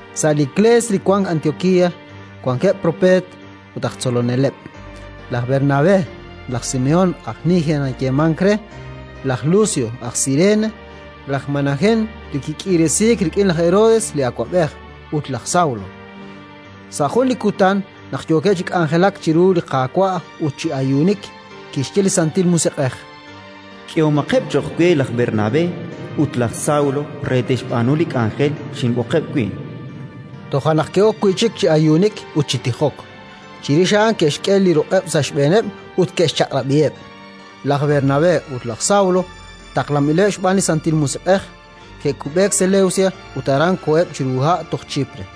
Sa' li Iklees li wank Antiokía wankeb' propeet ut aj tzoloneleb': laj Bernabé, laj Simehón, aj Niger nayeemank re, laj Lucio aj Sirene, laj Manahén li kik'iiresiik rik'in laj Herodes li awab'ej, ut laj Sawlo. Sa' jun li kutan, naq yookeb' chi k'anjelak chiru li Qaawa' ut chi ayuunik, kixye li Santil Musiq'ej: “K'ehomaqeb' cho'q we laj Bernabé ut laj Sawlo re te'xb'aanu li k'anjel xinb'oqeb' wi'”. Toja' naq ke'ok wi' chik chi ayuunik ut chi tijok; chirix a'an ke'xk'e li ruq'eb' sa' xb'eeneb' ut ke'xchaq'rab'iheb'. Laj Bernabé ut laj Sawlo, taqlanb'ileb' xb'aan li Santil Musiq'ej, ke'kub'eek Selewsia ut aran koheb' chiru ha' toj Chipre.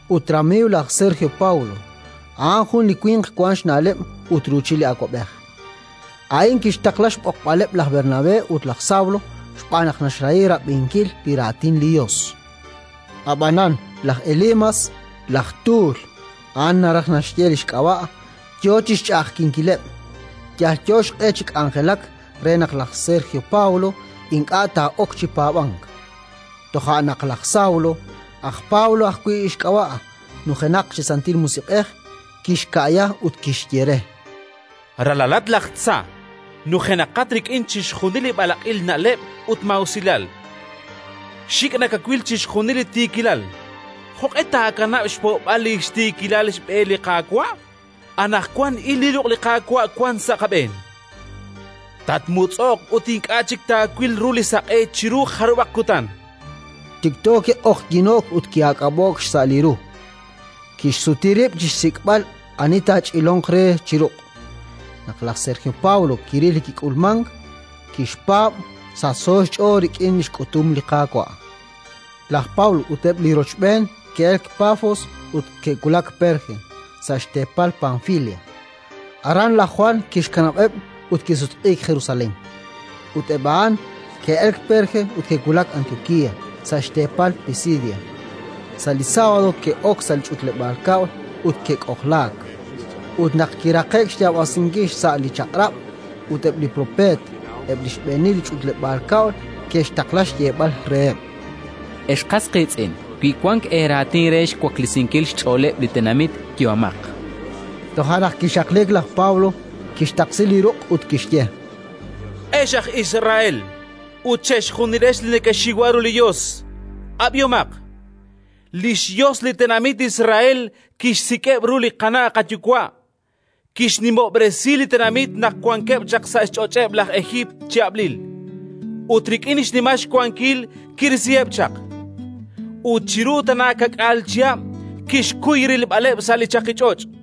ut ramiiw laj Sergio Pawlo, a'an jun li winq wank xna'leb' ut ruuchil li awab'ej. A'in kixtaqla xb'oqb'aleb' laj Bernabé ut laj Sawlo xb'aan naq naxrahi rab'inkil li Raatin li Yos. Ab'anan laj Elimas laj tuul (a'an naraj naxye li xk'ab'a') yo chi xch'a'ajkinkileb', yalyo xq'e chi k'anjelak re naq laj Sergio Pawlo ink'a' taa'ok chi paab'ank. Toja' naq laj Sawlo, aj Pablo ajwi' xk'ab'a', nujenaq chi Santil Musiq'ej, kixka'ya ut kixye re: —Ralalat laj tza, nujenaqat rik'in chixjunil li b'alaq'il na'leb' ut maa'usilal, xik' nakawil chixjunil li tiikilal! Jo'q'e taakanab' xpo'b'al li xtiikil b'e li Qaawa'? Anaqwan il, li ruq' li Qaawa' wank sa' aab'een. Tatmutz'o'q ut ink'a' chik taawil ru li saq'e chiru jarub'aq kutan. Tikto kiq'oqyino'k ut ki'aak'ab'o'k xsa' li ru: tixsuti rib' chi xsik'b'al ani taach'ilonq re chi ruq'. Naq laj Sergio Pawlo kiril li kik'ulmank, kixpaab', sachso xch'ool rik'in li xk'utum li Qaawa'. Laj Pablo ut eb' li rochb'een ke'elk Pafos ut ke'wulak Perge, sa' xteepal Panfilia. Aran laj Jwan kixkanab'eb' ut kisutq'iik Jerusalén, ut eb' a'an ke'elk Perge ut ke'wulak Antiokía, sa' xteepal Pisidia. Sa' li sábado ke'ok sa' li ch'utleb'aal kab'l ut ke'k'ojlaak. Ut naq kiraqe'k xyaab'asinkil xsa' li Chaq'rab' ut eb' li Propeet, eb' li xb'eenil li ch'utleb'aal kab'l ke'xtaqla xyeeb'al reheb': —Ex qas qiitz'in, wi wank eeraatin re xwaklesinkil xch'ooleb' li tenamit, yehomaq. Toja' naq kixaqliik laj Pablo, kixtaqsi li ruq' ut kixye: —Ex aj Israel ut chejunilex li nekexiwa ru li Yos, ab'ihomaq. Li xYos li tenamit Israel kixsik'eb' ru li qana' qayuwa', kixnimob'resi li tenamit naq wankeb' chaq sa' xch'och'eb' laj Ejiipt chi ab'lil, ut rik'in xnimal xwankil kirisiheb' chaq. Ut chiru tana ka'k'aal chihab' kixkuy rilb'aleb' sa' li chaqich'och'.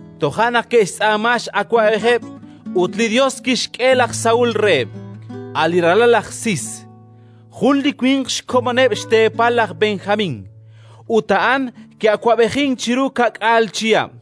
Toja' naq ke'xtz'aama x'awab'ejeb', ut li Yos kixk'e laj Saúl reheb', a' li ralal laj Sis, jun li winq xkomoneb' xteepal laj Benjamín; ut a'an ki'awab'ejink chiru ka'k'aal chihab'.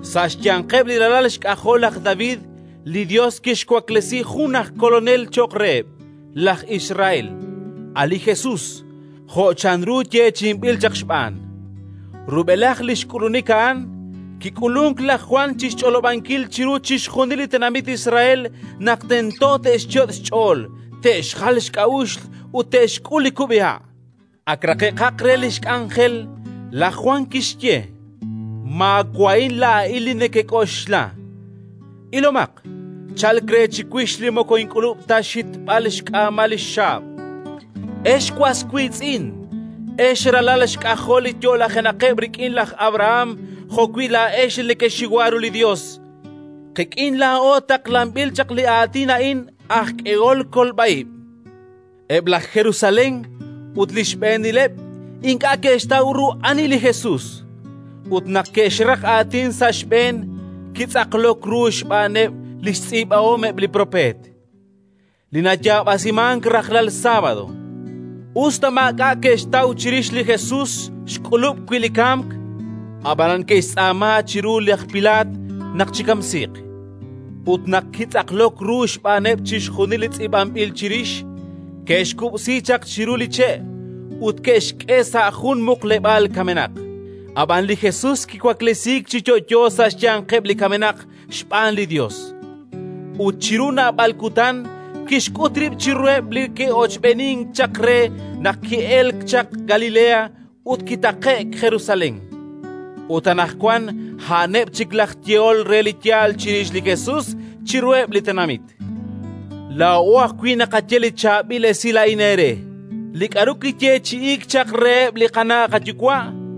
Sa' xyanqeb' li ralal xk'ajol laj David li Yos kixwaklesi jun aj Kolonel cho'q reheb' laj Israel, a' li Jesus, jo' chanru yeechi'inb'il chaq xb'aan. Rub'elaj li xk'ulunik a'an, kik'ulunk laj Jwan chi xch'olob'ankil chiru chixjunil li tenamit Israel naq tento te'xyot' xch'ool te'xjal xk'a'uxl ut te'xk'ul li kub'iha'. Ak raqe'kaq re li xk'anjel, laj Jwan kixye: «Maawa'in laa'in li nekek'oxla. Ilomaq, chalk re chiwix li moko ink'ulub' ta xhitb'al xk'aamal li xxaab'». “Ex was wiitz'in, ex ralal xk'ajol li yo'lajenaqeb' rik'in laj Abrahán jo'wi' laa'ex li nekexiwa ru li Yos, qik'in laa'o taqlanb'il chaq li Aatin a'in aj k'ehol kolb'a ib'. Eb' laj Jerusalén ut li xb'eenileb' ink'a' ke'xtaw ru ani li Jesus, ut, naq ke'xraq aatin sa' xb'een, kitz'aqlok ru xb'aaneb' li xtz'iib'ahom eb' li Propeet li nayaab'asimank rajlal sábado. Us ta maak'a' ke'xtaw chirix li Jesus xk'ulub' wi' li kamk, ab'anan ke'xtz'aama chiru laj Pilaat naq chikamsiiq. Ut naq kitz'aqlok ru xb'aaneb' chixjunil li tz'iib'anb'il chirix, ke'xkub'si chaq chiru li che' ut ke'xk'e sa' jun xmuqleb'aal kamenaq. Ab'an li Jesus kiwaklesiik chi yo'yo sa' xyanqeb' li kamenaq xb'aan li Yos ut chiru naab'al kutan kixk'ut rib' chiruheb' li ke'ochb'eenink chaq re naq ki'elk chaq Galilea ut kitaqe'k Jerusalén. Ut anaqwan a'aneb' chik laj yehol re li yaal chirix li Jesus chiruheb' li tenamit. “Laa'o ajwi' naqaye li Chaab'il Esilal a'in eere: Li k'aru kiyeechi'iik chaq reheb' li qana' qayuwa'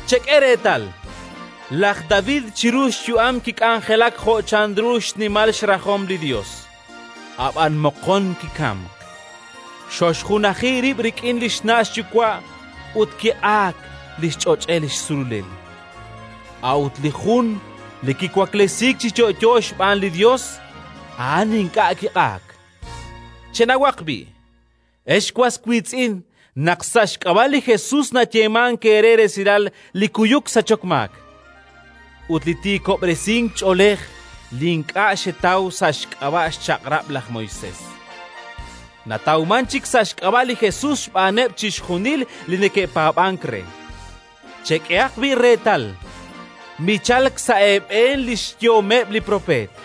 Chek'e reetal, laj David chiru li xyu'am kik'anjelak jo' chanru li xnimal rajom li Yos, ab'an moqon kikamk, koxjunaji rib' rik'in li xna' xyuwa' ut kiq'aak li xch'och'el xsululel. A'ut li jun li kiwaklesiik chi yo'yo xb'aan li Yos, a'an ink'a' kiq'aak. Chenawaq b'i', ex was wiitz'in, naq sa' xk'ab'a' li Jesus nayeemank eere resilal li kuyuk sachok maak. Ut li tiikob'resink ch'oolej li ink'a' xetaw sa' xk'ab'a' xChaq'rab' laj Moisés natawmank chik sa' xk'ab'a' li Jesus xb'aaneb' chixjunil li neke'paab'ank re. Chek'ehaq b'i' reetal, michalk sa' eeb'een li xyehomeb' li propeet: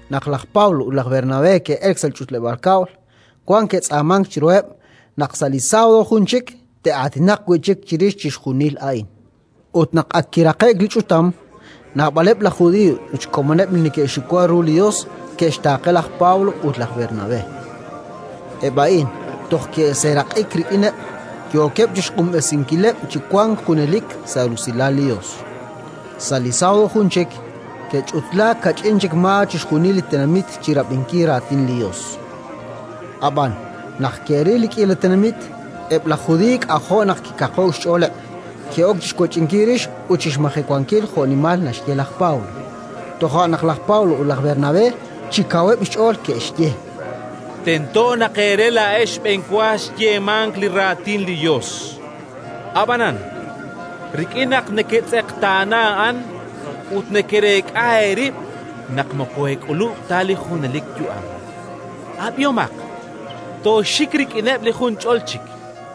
Naq laj Pablo ut laj Bernabé ke'elk sa' li ch'utleb'aal kab'l, wan ke'tz'aamank chiruheb' naq sa' li sábado jun chik te'aatinaq wi' chik chirix chixjunil a'in. Ut naq ak kiraqe'k li ch'utam, naab'aleb' laj Judiiy ut xkomoneb' li neke'xxiwa ru li Yos ke'xtaaqe laj Pablo ut laj Bernabé. Eb' a'in toj ke'seeraq'ik rik'ineb', yookeb' chi xq'unb'esinkileb' chi wank junelik sa' rusilal li Yos. Sa' li sábado jun chik ke'ch'utlaak kach'in chik maa chixjunil li tenamit chi rab'inkil Raatin li Yos. Ab'an, naq ke'ril li k'iila tenamit, eb' laj Judiiy k'ajo' naq kikaqo'k xch'ooleb'; ke'ok chi xwech'inkil rix ut chi xmajewankil jo'nimal naxye laj Pablo. Toja' naq laj Pablo ut laj Bernabé chi kaweb' xch'ool ke'xye: —Tento naq eere laa'ex xb'enwa xyeemank li Raatin li Yos. Ab'anan, rik'in naq neketz'eqtaana a'an ut nekereek'a eerib' naq moko eek'ulub' ta li junelik yu'am, ab'ihomaq: tooxik rik'ineb' li junch'ol chik.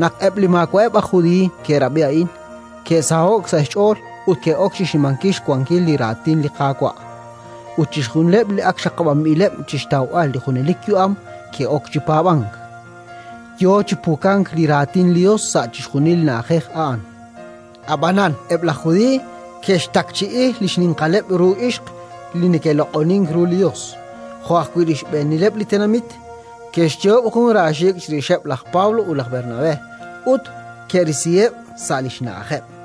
Naq eb' li maawa'eb' aj Judiiy ke'rab'i a'in, ke'saho'k sa' xch'ool ut ke'ok chi xnimankil xwankil li Raatin li Qaawa'. Ut chixjunileb' li ak xaqab'anb'ileb' chi xtawb'al li junelik yu'am ke'ok chi paab'ank, yo chi pukank li Raatin li Yos sa' chixjunil li na'ajej a'an. Ab'anan eb' laj Judiiy ke'xtakchi'i li xninqaleb' ru ixq li neke'loq'onink ru li Yos, jo' ajwi' li xb'eenileb' li tenamit; ke'xyoob' jun raaxiik' chirixeb' laj Pablo ut laj Bernabé ut ke'risiheb' sa' li xna'ajeb'.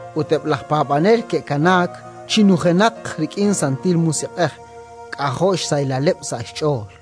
Ut eb' laj paab'anel ke'kanaak chi nujenaqeb' rik'in Santil Musiq'ej, k'ajo' xsahilaleb' sa' xch'ool.